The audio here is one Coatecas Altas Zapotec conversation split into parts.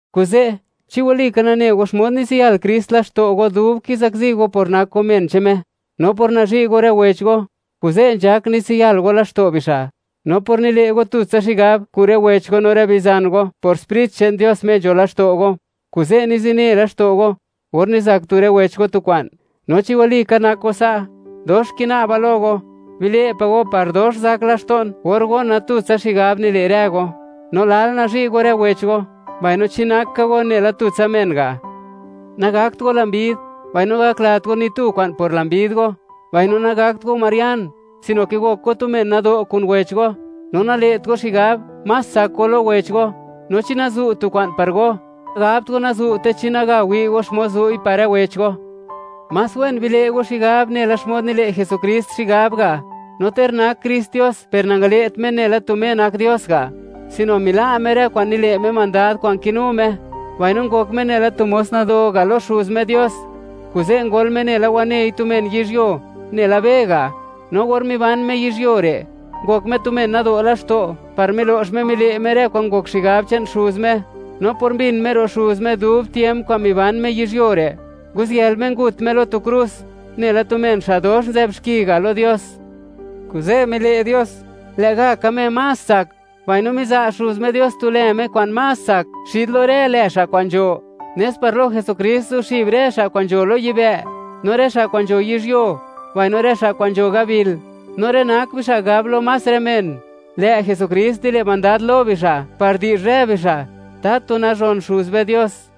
Kuze', chi walika nane go xmod nitsiyal Krist laxto' go dub kizakzi go por nak go men che'n Me; no por nazhi' go rë wech go, kuze' nzhak nitsiyal go laxto' bixa'; no por nile' go tutsa xigab kun rë wech go no rë bizan go por Sprit che'n Dios Me nzho laxto' go, kuze' nizine laxto' go or nizak tu rë wech go tu kwa'n; no chi walika nak go sa', dox kina'ba lo go: Bile' pa' go par dox zak laxto'n or gona, tutsa xigab nile' rë go, no lal nazhi' go rë wech go, mbaino chi nak ka go nela tutsa men ga'. Nagakt go lambid mbaino nagaklat go ni tu kwa'n por lambid go; mbaino nagakt go marian, sino ke gok go tu men nado' kun wech go, no nale't go xigab, más tsak go lo wech go. No chi nazu' tu kwa'n par go, gabt go nazu'te chi naga wi' go xmod zu'i par rë wech go. Más wen bile' go xigab nela xmod nile' Jesukrist xigab ga'. No ter nak Krist Dios, per nangale't Me nela tu Me nak Dios ga', sino mila' Me rë kwa'n nile' Me mandad kwa'n kinu Me, mbaino ngok Me nela tu mos nado ga' lo Xuz Me Dios, kuze' ngol Me nela wanei tu men yizhyuo, nela be ga'. No or miban Me yizhyuo re', ngok Me tu men nado' laxto' par milo'x Me mile' Me rë kwa'n ngok xigab che'n Xuz Me. No por mbin Me ro' Xuz Me dub tiemp kwa'n miban Me yizhyuo re', nguziyël Me ngut Me lo tu krus, nela tu men xa' dox nzë'b xki ga' lo Dios. Kuze', mile' Dios, lë'gaka Me más tsak, mbaino miza' Xuz Me Dios tu lë Me kwa'n más tsak xid lo rë lë xa' kwa'n nzho, nes par lo Jesukrist, zuxib rë xa' kwa'n nzho lo yibë', no rë xa' kwa'n nzho yizhyuo, mbaino rë xa' kwa'n nzho gabil, no rë nak bixa' gab lo más rë men, lë' Jesukrist nile' mandad lo bixa', par di'zh rë bixa', ¡tatu nazhon Xuz be Dios!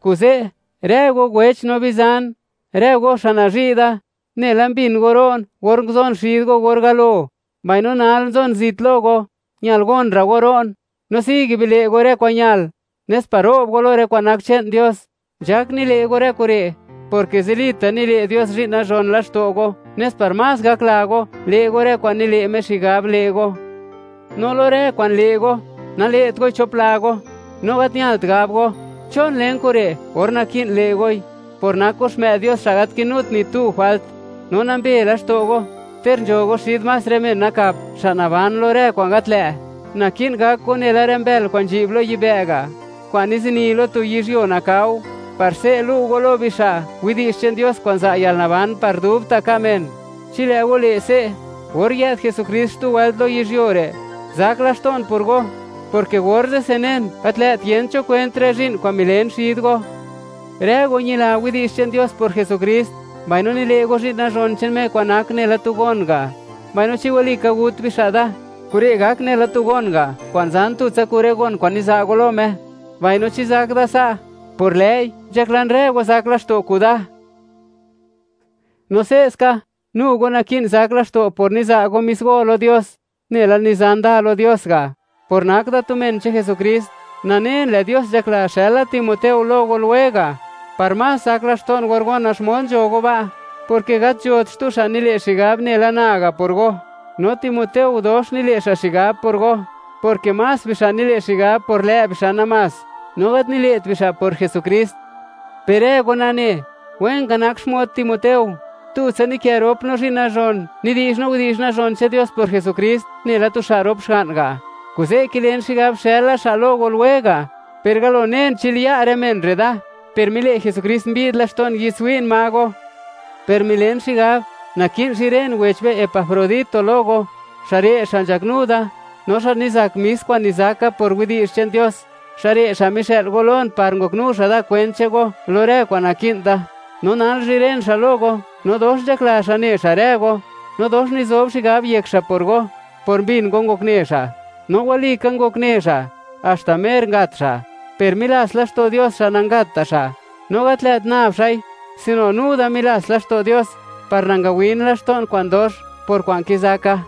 Kuze', rë go wech no bizan, rë go xa' nazhi' da, nela mbin go ro'n or nguzon xid go or galo, mbaino nal nzon zit lo go, ñal gon ra' go ro'n, no sigue bile' go rë kwa'n ñal, nes par ro'b go lo rë kwa'n nak che'n Dios. Nzhak nile' go rë kure', porke zilita' nile' Dios zhi'n nazhon laxto' go nes par más gakla go, le' go rë kwa'n nile' Me xigab, le' go. No lo rë kwa'n le' go, nale't goi chop la go; no gat ñalt gab go: “¿Chon len kure'?”, or naki'n le' goi, par gak go xmë'd Dios xa' gat kinut ni tu jwalt, no nambe laxto' go; ter nzho go xid más rë men nakap, xa' naban lo rë kwa'n gat lë'. Naki'n gak go nela rë mbël kwa'n nzhi'b lo yibë' ga', kwa'n nizini lo tu yizhyuo nakao, par se' lu' go lo bixa', widi'zh che'n Dios kwa'n za' yalnaban par dubta' ka' men. Chi lë' go le' se', or yë'd Jesukrist xtu wëlt lo yizhyuo re', zak laxto'n por go, porke orze'se nen, gat lë't yent cho kwent rë zhi'n kwa'n milen xid go. Rë go ñila widi'zh che'n Dios por Jesukrist, mbaino nile' go zhi'n nazhon che'n Me, kwa'n nak nela tu gon ga'. Mbaino chi walika gut bixa' da, kure' gak nela tu gon ga' kwa'n zan tutsa kun rë gon kwa'n niza' go lo Me, mbaino chi zak da sa', por lë'i nzhaklan rë go zak laxto' kuda. No se'ska, nu go naki'n zak laxto' por niza' go mis go lo Dios, nela nizan da lo Dios ga'. Por nak da tu men che'n Jesukrist, nanen lë' Dios nzhakla, xëla Timoteo lo go lwega', par más zak laxto'n or gona xmod nzho go ba', porke gat nzhot xtu xa' nile' xigab nela na ga' por go, no Timoteo dox nile' xa' xigab por go, porke más bixa' nile' xigab por lë' bixa' namás, no gat nile't bixa' por Jesukrist. Per rë go nane, wen ka nak xmod Timoteo; tutsa nikë rop no zhi'n nazhon, nidi'zh no widi'zh nazhon che'n Dios por Jesukrist nela tu xa' rop xga'n ga'. Kuze' kilen xigab xëla xa' lo go lwega', per galo nen chi liya' rë men re' da, per mile' Jesukrist mbi'd laxto'n, yi'dtswi'n ma go. Per milen xigab, naki'n zhiren wech be Epafrodito lo go, xa' re' xa' nzhaknu da, no xa' nizak mis kwa'n nizaka por widi'zh che'n Dios; xa' re' xa' mixë'l go lon par ngoknu xa' da kwent che'n go lo rë kwa'n naki'n da. No nal zhiren xa' lo go no dox nzhakla xa' ne xa' rë go, no dox nizob xigab yek xa' por go por mbin go ngokne xa'. No walika ngokne xa' haxta mer ngat xa'; per milats laxto' Dios xa' nangatta' xa', no gat lë't nab xa'i sino nu da milats laxto' Dios par nangawin laxto'n kwa'n dox por kwa'n kizaka.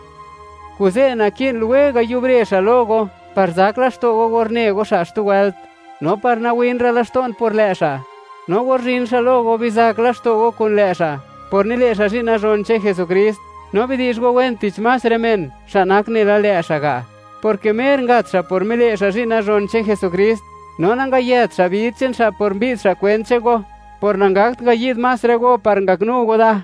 Kuze' naki'n lwega' yubre xa' lo go par zak laxto' go or ne go xa' xtu wëlt, no par nawinra' laxto'n por lë' xa'. No or zhin xa' lo go, bizak laxto' go kun lë' xa' por nile' xa' zhi'n nazhon che'n Jesukrist; no bidi'zh go wen tich más rë men, xa' nak nela lë' xa' ga', porke mer ngat xa' por mile' xa' zhi'n nazhon che'n Jesukrist, no nangayet xa' bid che'n xa' por mbi'd xa' kwent che'n go, por nangakt ngayi'd más rë go par ngaknu go da.